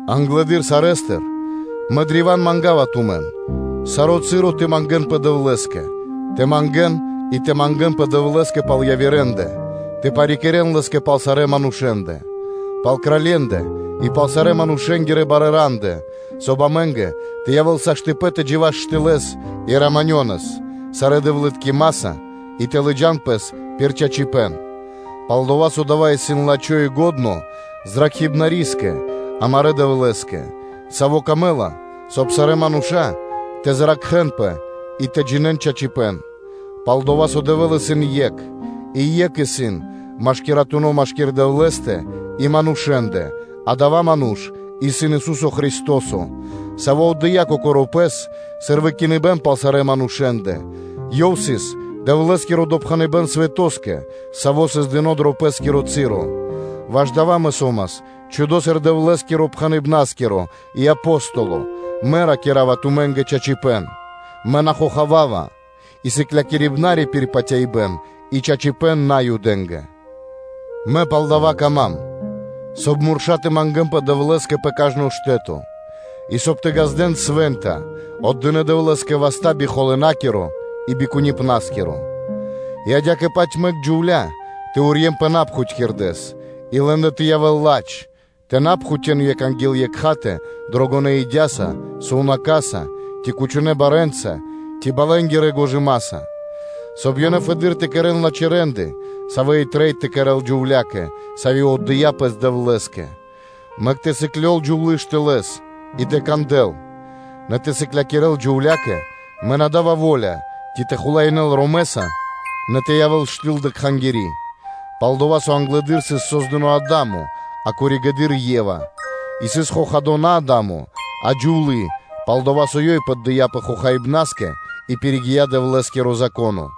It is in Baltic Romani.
Англэды́р сарэ́стыр, мэ древа́н манга́ва тумэн, саро́ часо тэ мангэ́нпэ Дэвлэ́скэ, тэ мангэ́н и тэ мангэ́нпэ Дэвлэ́скэ пал явирэндэ тэ парикирэ́н Лэ́скэ пал сарэ́ манушэ́ндэ, пал кралье́ндэ и пал сарэ́ манушэ́нгирэ барэ́ рандэ, соб (кай) амэ́нгэ тэ явэ́л саштыпэн (возможность/ваканцыя) тэ джива́с штылэ́с и раманёнэ́с (мирнэс) сарэ́ дэвлыткимаса и тэ лыджа́н пэс пир чачипэ́н; пал-дова́ со дава́ исын лачхо́ и лачхо́ Зракхибнарискэ, амарэ́ Дэвлэ́скэ, Саво́ камэ́ла, соб (кай) сарэ́ мануша́ тэ зракхэнпэ и тэ джинэ́н чачипэ́н. Пал-дова́ со Дэвэ́л исын Екх, и екх исын машкиратуно (посреднико) машки́р Дэвлэ́стэ и манушэ́ндэ, адава́ ману́ш исын Ису́со Христо́со, Саво́ отдыя́ Кокоро́ Пэс, сыр выкиныбэ́н пал сарэ́ манушэ́ндэ, Ёв сыс Дэвлэ́скиро допхэныбэ́н свэтоскэ, саво́ сыс дыно́ дро пэ́скиро часо; ваш дава́ мэ со́мас чхудо сыр Дэвлэ́скиро пхэныбнаскиро и Апостоло, – мэ ракира́ва тумэ́нгэ чачипэ́н, мэ на хохавава, и мэ сом сыклякирибнари пир патяибэ́н и чачипэ́н Наюдэ́нгэ. Мэ палдава́ кама́м, соб (кай) мурша́ тэ мангэ́нпэ Дэвлэ́скэ пэ кажно штэ́то, и соб (кай) тэ ґаздэ́н свэ́нта, отдынэ́ Дэвлэ́скэ васта́ би холынакиро и би куниныпнаскиро. И адя́кэ-паць мэк джувля́ тэ урьенпэ патывалэс, и лэ́ндэ тэ явэ́н ладж, тэ на пхутён екх анги́л екхатэ дрогонэ́ идяса, сувнака́са, ци кучонэ́ барэ́нца, ци балэнгирэ гожымаса, нэ соб (кай) ёнэ фэды́р тэ кэрэ́н лачхэ́ рэ́нды, савэ́ и трэй тэ кэрэ́л джувля́кэ, сави́ отдыя́ пэс Дэвлэ́скэ. Мэк тэ сыклёл джувлы́ штылэ́с, и тэ кандэл; нэ тэ сыклякирэ́л джувля́кэ мэ на дава́ во́ля, ци тэ хулаинэ́л ромэса, нэ тэ явэ́л ёй штыл дрэ кхангири́; пал-дова́ со англэды́р сыс создыно́ Адамо, а коригэды́р (позжэ) Ева. И сыс хохадо на Адамо, а джувлы́, пал-дова́ со ёй поддыяпэ хохаибнаскэ и пиригия Дэвлэ́скиро Зако́но.